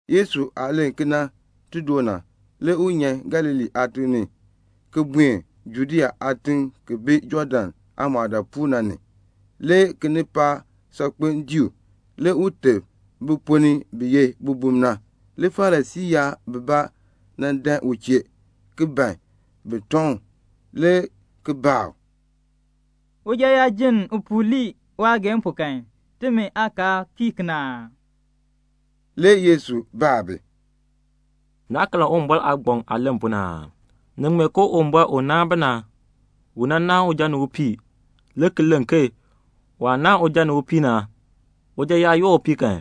Yesu aah len kena ti doo na, le u nyan Galilee aatiŋ ni, le ki buen Judea aatiŋ ki bi Jɔɔdan aamɔɔdaapuul na ni. Le kinipaak saakpeŋ dii u. Le u teb bi ponn ni bi ye bibum na. Le Farisii yaab bibaa nan dan u chee, le ki ban bin tɔŋ u, le ki baa u, "Uja yaa jenn upuu lii waageehn pu kan, timi aakaal kii kena aa?" Le Yesu baa bi, "Naa karn Uwumbɔr aagbaŋ aah len pu na aa? Ni ŋmee ke Uwumbɔr u naan bi na, u nan naan uja ni upii, le ki len ke waah naan uja ni upii na, uja yaa yoor upii kan,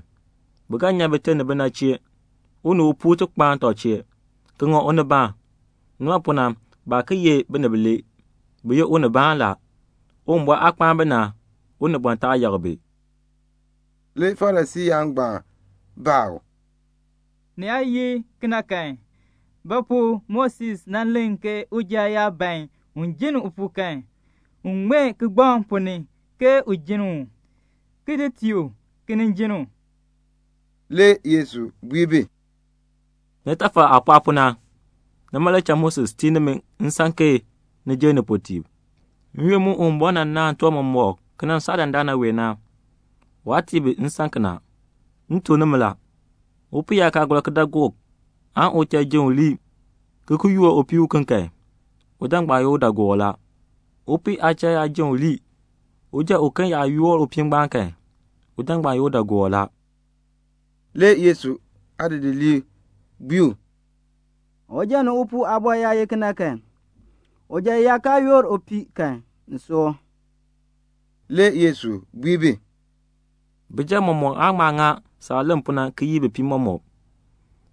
bi ga nyan bite ni bina chee, u ni upuu ti kpaan tɔb chee, ki ŋa unibaan. Nima pu na baa ki ye binib bilee, bi ye unibaan la. Uwumbɔr aah kpaan bi na, unibɔn taa yakr bi." Le Farisii yaab baa u, "Ni yaa ye kena kan, ba pu Moses nan len ke uja yaa ban un jenn upuu kan, un ŋmee kigbaŋ ponn ni ke u jenn u, ki di tii u, le ki nin jenn u?" Le Yesu bui bi, "Nitafal aah pɔɔ pu na, nima le cha Moses tii nimi nsan ke ni jenn nipuutiib. N-yoonn mu Uwumbɔr naan tiwan mɔmɔk ki nan saa dandana wee, waa tii bi nsan kena. M tuk nimi la, upii yaa kaa gɔr kidaagook kan, uchal yaa jenn u lii ki ki yoor upii uken kan, uja ngbaan ye udaagoor la. Upii aachal yaa jenn u lii, uja uken yaa yoor upii ngbaan kan, uja ngbaan ye udaagoor la." Le Yesu aadidiliib bui u, "Uja ni upuu aabɔr yaa ye kena kan, uja yaa kaa yoor upii kan, ni soor." Le Yesu bui bi, "Bijab mɔmɔk aan ŋma ŋa saah len pu na ki yii bipiib mɔmɔk.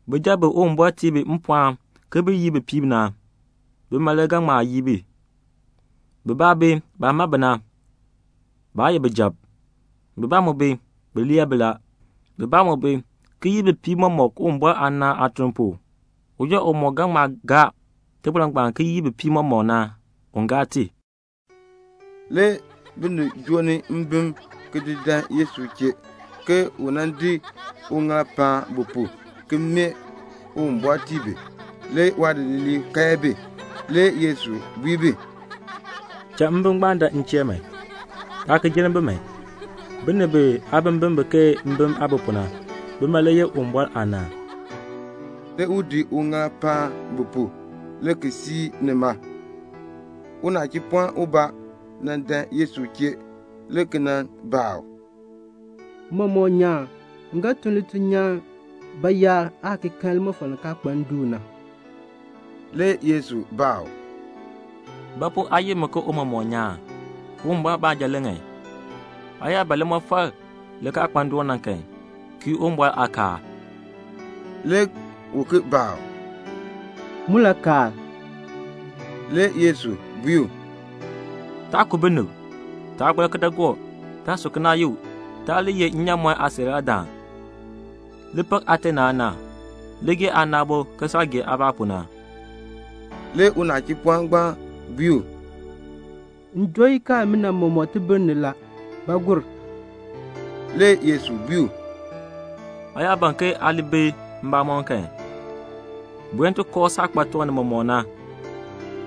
Bijab bi Uwumbɔr tii bi mpɔɔn ke bin yii bipiib na, bima le ga ŋma yii bi. Bibaa bi, baah ma bi na, baa ye bijab. Bibaa mu bi, bi lee bi. Bibaa mu bi, ki yii bipiib mɔmɔk Uwumbɔr aanaan aatuln pu. Uja umɔk ga ŋma gaa iliin ngbaan ki yii bipiib mɔmɔk na, un gaa i." Le binib joo ni mbim ki di dan Yesu chee, ke u nan di uŋaal ki di paan bi pu, ki mee Uwumbɔr tii bi. Le waadidiliib kae bi. Le Yesu bui bi, "Cha mbim ngbaan dan m chee man. Taa ki jenn bi man. Binib biyaabimbin bi ke mbim aah bi pu na, bima le yeh Uwumbɔr aanaan." Le u di uŋaal ki di paan bi pu, le ki siir nima. Le unachipɔɔn ubaa nan dan Yesu chee le ki nan baa u, "Tiicha nyaan, m ga tun lituln nyaan bayaar aan ki kan limɔfal li kaa kpa ndoon na?" Le Yesu baa u, "Ba pu aa yi mi ke Tiicha nyaan? Uwumbɔr baanja le ŋan. Aa yaa ban limɔfal li kaa kpa ndoon na kan, kii Uwumbɔr aakaal." Le u ki baa u, "Mulakaal?" Le Yesu bui u, "Taa ku binib; taa gɔr kidaagook; taa su kinaayuk; taa li ye nnyaamɔn aasiiraadaan; li pak aate ni aana; li gee aana aabo ke saah gee aabaa pu na." Le unachipɔɔn ngbaan bui u, "M joo ikaal imina mɔmɔk tibir ni la. Ba gur?" Le Yesu bui u, "Aa yaa ban ke aa li bi mbamɔm kan, buen ti kooh saah kpa tiwan nimɔk na,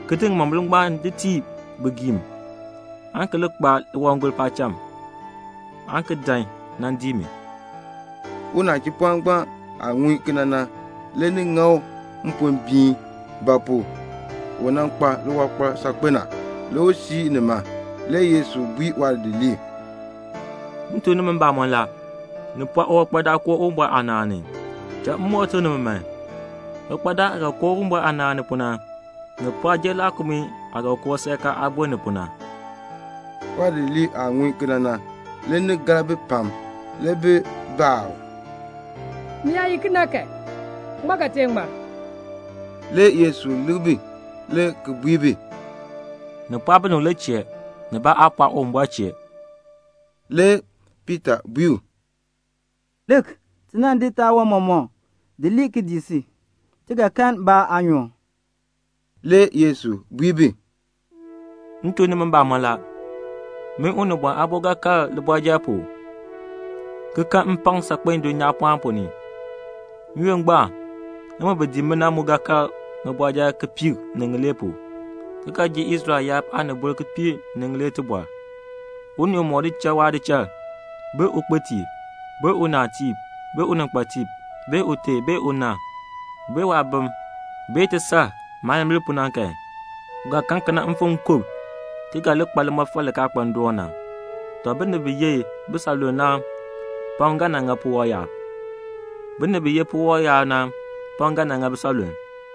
ki di ŋimombil ngbaan ki di tii bigiim, aan ki li kpa liwangol paacham, aan ki dan nan dii mi." Unachipɔɔn ngbaan aah ŋun kena na, le ni ŋa u mpombiin; ba pu? u kpa liwankpal saakpen a. Le u siir nima. Le Yesu bui waadidiliib, "M tuk nimi mbamɔn la, ni pɔɔ uwankpadaan koo Uwumbɔr aanaan ni. Cha m moo tuk nimi, uwankpadaan aah ga koo Uwumbɔr aanaan ni pu na, ni pɔɔ ki jer laakumii aah ga koo seerkaa aameer ni pu na." Waadidiliib aah ŋun kena na, le ni gar bi pam. Le bi baa u, "Ni yaa ye kena kan, ŋmaa ga tee ŋmar?" Le Yesu lik bi le ki bui bi, "Ni pɔɔ binib le chee. Nibaa aa pɔɔ Uwumbɔr chee." Le Piita bui u, "Lik, ti nan di taawan mɔmɔk di lii ki dii si. Ti ga kan ba aanyoor?" Le Yesu bui bi, "M tuk nimi mbamɔn la, min Unibɔn Aabo ga kal libɔrjal pu, ki kan mpakm saakpen dulnyaapɔɔn ponn ni. N-yoonn ngbaan, nimi bi dii mi na mu ga kal ŋibɔrjal kipiik ni ŋilee pu, ki ga ji Israel yaab aanibol kipiik ni ŋilee tibɔr. Unii umɔk di cha waadichal, aan ukpitiib, aan unaatiib, aan uninkpatiib, aan ute, aan una, aan waabim, aan tisar, maayimbil pu na kan, u ga kan mfim nkub, ki ga li kpa limɔfal li kaa kpa ndoon na. Tɔ, binib pam bi ye bisanlulm na, le ga nan ŋa puwɔb yaab. Binib pam bi ye puwɔb yaab na, le ga nan ŋa bisanlulm."